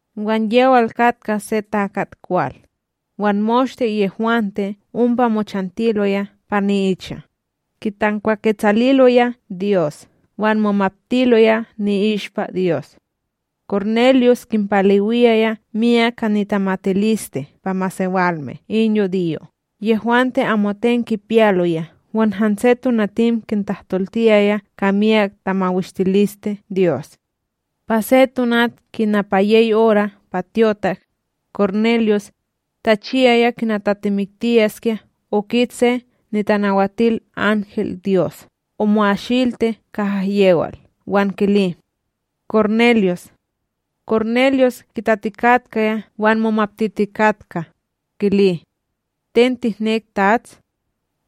Wan yewal katka se takat kwal, wan moshte yehwante ompa mochantiloya pa ni'icha, kitankwaketsaliloya Dyos wan momaptiloya ni'ishpa Dyos. Kornelyus kinpalewiyaya miyak ka nitemakaliste pa masewalme in yudiyo' yehwante amoten kipiyaloya wan hanse tonatim kitahtoltiyaya ka miyak tamawishtiliste Dyos. Pa se tonat kina pa yey ora' pa tyotak, Kornelyus, tachiyaya kina tatimiktiyaskya okit se nitanawatilanhelDyos omo'asilti kaha yewal wan kili: —Kornelyus! Kornelyus kitatikatkaya wan momaptitikatka, kili: —Ten tihnek, Tats?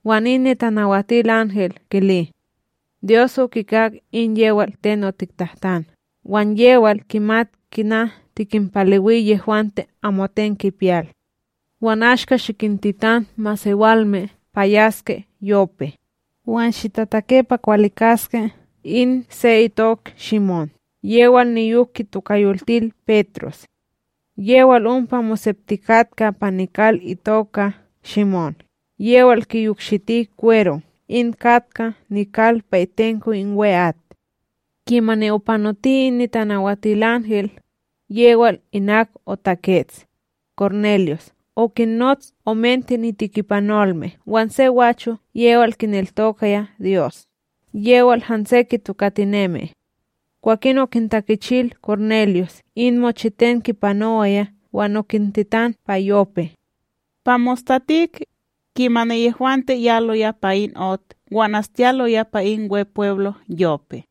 Wan in tanawatilanhel kili: —Dyos okikak in yewal ten otiktahtan wan yewal kimat kina tikinpalewi yehwante amoten kipiyal. Wan ashka, shikintitan masewalme pa yaske Yope, wan shitatake pa kwalikaske in se itok Shimón yewal niyok kitokayoltil Petros. Yewal ompa moseptikatka pa nikal se itoka Shimón yewal kiyokshiti kwero in katka nikal pa itenko in We'at. Kimani opanoti in tanawatilanhel, yewal inak otakets, Kornelyus okinnots omente nitekipanolme wan se gwacho yewal kineltokaya Dyos yewal hanse kitokatinemi. Kwakin okintakichil Kornelyus in mochiten kipanowaya wan okintitan pa Yope. Pa mostatik, kimani yehwante yaloya pa in ot wan astiyaloya pa in Wepweblo Yope.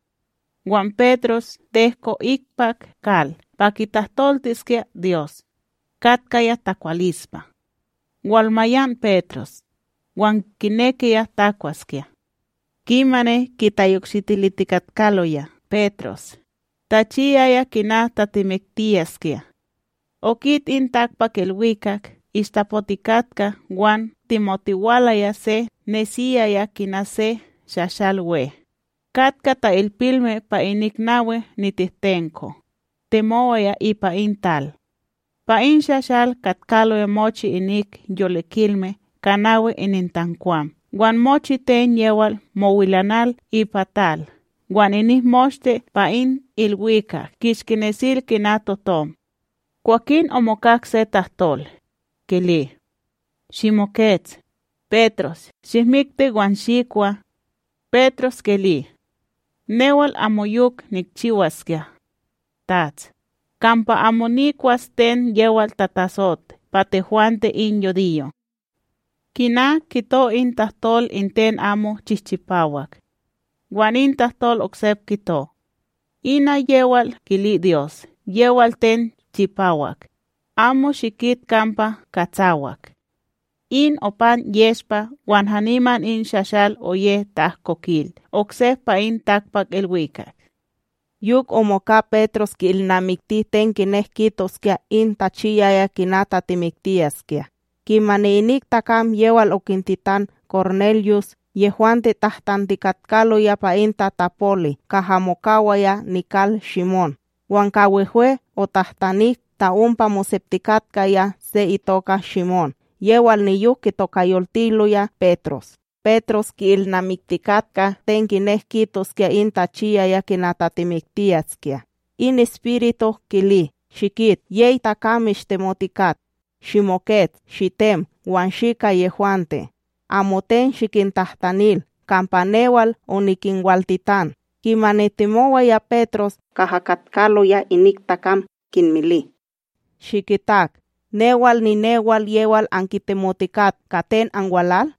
Wan Petros tehko ikpak kal pa kitahtoltiskya Dyos, katkaya takwalispa. Walmayan Petros, wan kinekiya takwaskya. Kimani kitayokshitilitikatkaloya Petros, tachiyaya kina tatimiktiyaskya, okit in takpakIlwikak ishtapotikatka wan temotiwalaya se nesiyaya kina se shashalWe, katkaya ta'ilpilme pa inik nawi nitehtenko, temowaya ipa in tal. Pa in shashal katkaloya mochi inik yolikilme ka nawi inintankwam wan mochiten yewal mowilanal ipa tal wan inik moshte pa in ilwikak kishki nesil kina totom. Kwakin omokak se tahtol, kili: —Shimokets, Petros shihmikti wan shikwa. Petros kili: —Newal amoyok nikchiwaskya, Tats, kampa amo nikwas ten yewal tatatsot pa tehwante in yudiyo', kina kito in tahtol in ten amo chihchipawak. Wan in tahtol oksep kito: —Ina yewal kili Dyos yewal ten chipawak, amo shikit kampa katsawak. In opan yeshpa wan haniman in shashal oye ta'ahkokil oksep pa in takpakIlwikak. Yok omoka Petros ki'ilnamikti ten kinek kitoskya in tachiyaya kina tatimiktiyaskya, kimani inik takam yewal okintitan Kornelyus, yehwante tahtantikatkaloya pa in tatapoli kaha mokawaya nikal Shimón. Wan ka wehwe otahtanik ta ompa moseptikatkaya se itoka Shimón yewal niyok kitokayoltiloya Petros. Petros ki'ilnamiktikatka ten kinek kitoskya in tachiyaya kina tatimiktiyaskya, in Espiritu kili: —Shikit; yey takam mishtemotikat. Shimokets, shitem wan shi ka yehwante, amoten shikintahtanil, kampa newal onikinwaltitan. Kimani temowaya Petros kaha katkaloya inik takam, kinmili: —Shikitak. Newal ninewal yewal ankitemotikat. Ka ten anwalal?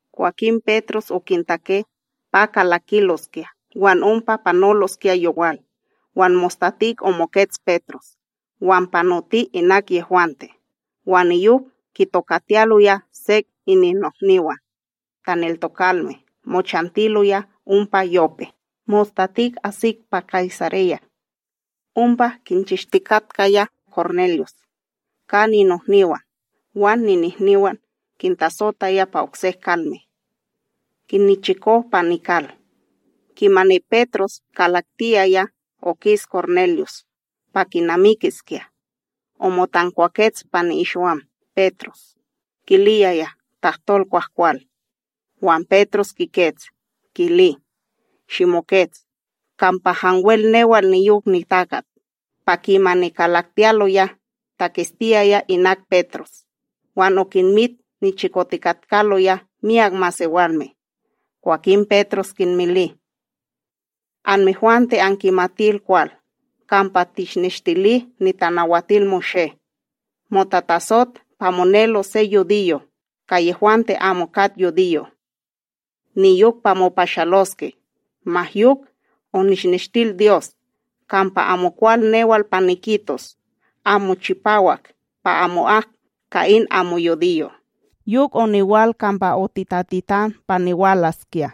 Kwakin Petros okintake pa kalakiloskya wan ompa panoloskya yowal. Wan mostatik omokets Petros, wan panoti inak yehwante, wan niyok kitokatiyaloya sek ininnohniwan taneltokalme, mochantiloya ompa Yope. Mostatik asik pa Kaysareya, ompa kinchishtikatkaya Kornelyus ka ninohniwan wan ninihniwan kintasotaya pa oksek kalme, kinnichiko pa nikal. Kimani Petros kalaktiyaya, okis Kornelyus pa kinamikiskya, omotankwakets pa ni'ikshiwam Petros, kiliyaya tahtol kwahkwal. Wan Petros kikets, kili: —Shimokets, kampa hanwel newal niyok nitakat. Pa kimani kalaktiyaloya taketstiyaya inak Petros wan okinmit nichikotikatkaloya myak masewalme. Kwakin Petros kinmili: —Anmehwante ankimatil kwal kampa tishneshtili NitanawatilMoshé, motatasot pa monelos se yudiyo ka yehwante amo kat yudiyo' niyok pa mopashaloske. Ma yok onishneshtil Dyos kampa amokwal newal pa nikitos amo chipawak pa amo'ak ka in amo yudiyo'. Yok oniwal kampa otitatitan pa niwalaskya,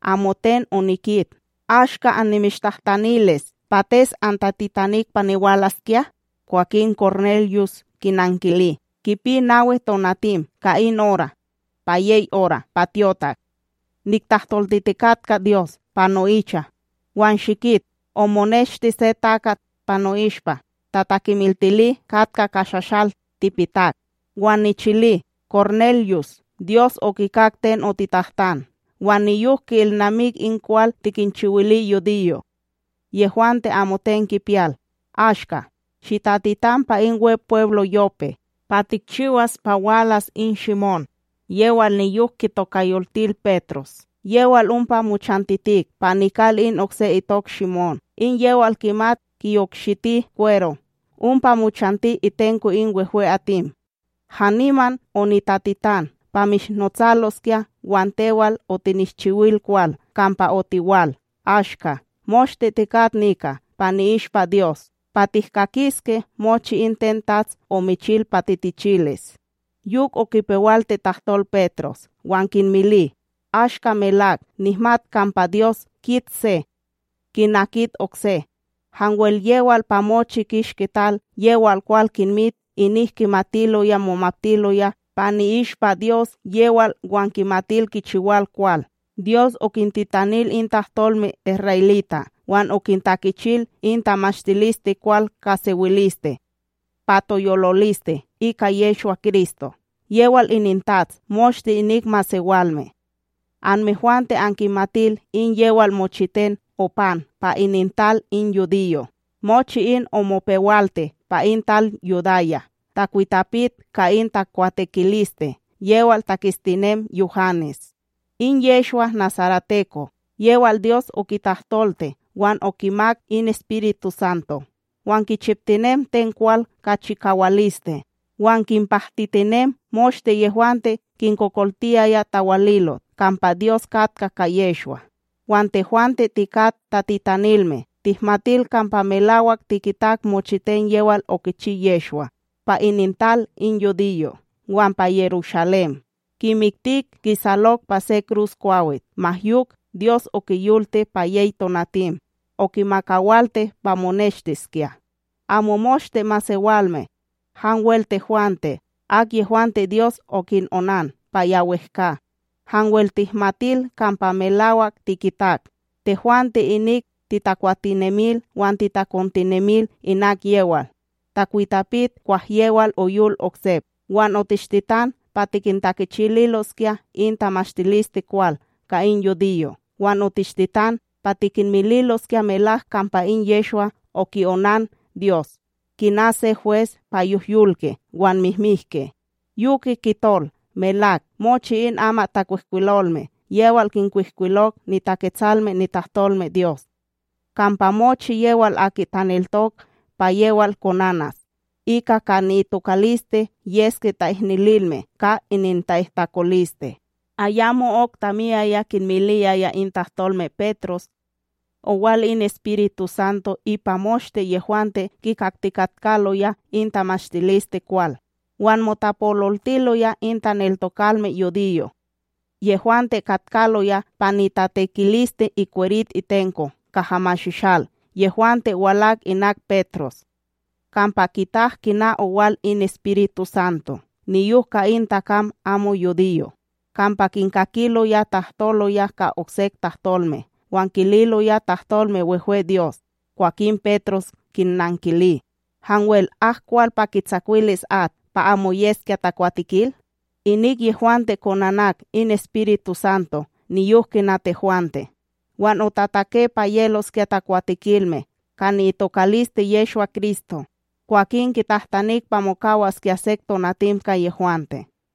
amoten onikit. Ashka annimishtahtanilis, pates antatitanik pa niwalaskya? Kwakin Kornelyus kinankili: —Kipi nawi tonatim ka in ora', pa yey ora' pa tyotak, niktahtoltitikatka Dyos pa no'icha wan shikit omoneshti se takat pa no'ishpa tatakimiltili katka ka shashal tipitak. Wan nichili: “Kornelyus Dyos okikak ten otiktahtan wan niyok ki'ilnamik in kwal tikinchiwili yudiyo' yehwante amoten kipiyal. Ashka, shitatitan pa in Wepweblo Yope pa tikchiwas pa walas in Shimón yewal niyok kitokayoltil Petros, yewal ompa mochantitik pa nikal in okse itok Shimón in yewal kimat kiyokshiti kwero ompa mochanti itenko in wehwe'atim.” Haniman, onitatitan pa mishnotsaloskya wan tewal otinishchiwil kwal kampa otiwal. Ashka, moshte tikat nika pa ni'ishpa Dyos pa tihkakiske mochi in ten TATS omichil pa titichilis. Yok okipewalti tahtol Petros wan kinmili: ―Ashka melak nihmat kampa Dyos kit se kina kit okse, hanwel yewal pa mochi kishki tal yewal kwal kinmit inik kimatiloya momaptiloya pa ni'ishpa Dyos yewal wan kimatil kichiwal kwal. Dyos okintitanil in tahtolme isra'elita' wan okintakichil in tamashtilisteKwal ka sewiliste pa toyoliliste ika Yehshwa-Kristo, yewal ininTATS moshte inik masewalme. Anmehwante ankimatil in yewal mochiten opan pa inintal in yudiyo'. Mochi in omopewalti pa in tal Yudaya, takwitapit ka in takwatekiliste yewal taketstinem Yuhanes. In Yehshwa nasareteko, yewal Dyos okitahtolti wan okimak in EspirituSanto, wan kichiptinem ten kwal ka chikawaliste wan kinpahtitinem moshte yehwante kinkokoltiyaya tawalilot kampa Dyos katka ka Yehshwa. Wan tehwante tikat tatitanilme, tihmatil kampa melawak tikitak mochiten yewal okichi Yehshwa pa inintal in yudiyo' wan pa Yerushalém, kimiktik kisalok pa se krusKwawit. Ma yok, Dyos okiyolti pa yey tonatim, okimakawalti pa moneshtiskya. Amo moshte masewalme, hanwel tehwante, akyehwante Dyos okinonan pa ya wehkA, hanwel tihmatil kampa melawak tikitak. Tehwante inik titakwatinemil wan titakontinemil inak yewal, takwitapit kwah yewal oyol oksep. Wan otishtitan pa tikintakichililoskya in tamashtilisteKwal ka in yudiyo'. Wan otishtitan pa tikinmililoskya melak kampa in Yehshwa oki'onan Dyos kina se hwes pa yohyolke wan mihmihke. Yoke kitol melak mochi in amatTakwihkwilolme yewal kinkwihkwilok niTaketsalme nitahtolmeDyos, kampa mochi yewal aki taneltok pa yewal konanas, ika ka ni'itokaliste yeske ta'ihnililme ka ininta'ihtakoliste. Ayamo'ok tamiyaya kinmiliyaya in tahtolme Petros, owal in EspirituSanto ipa moshte yehwante kikaktikatkaloya in tamashtilisteKwal. Wan motapololtiloya in taneltokalme yudiyo' yehwante katkaloya pa nitatekiliste ikwerit itenko kaha mashishal yehwante walak inak Petros, kampa kitak kina owal in EspirituSanto niyok ka in takam amo yudiyo'. Kampa kinkakiloya tahtoloya ka oksek tahtolme wan kililoya tahtolme wehwe Dyos. Kwakin Petros kinnankili: ―Hanwel ak kwal pa kitsakwilis at, pa amo yeske takwatekil? Inik yehwante konanak in EspirituSanto niyok kina tehwante? Wan otatake pa yeloskya takwatekilme ka ni'itokaliste Yehshwa-Kristo. Kwakin kitahtanik pa mokawaskya sek tonatim ka yehwante.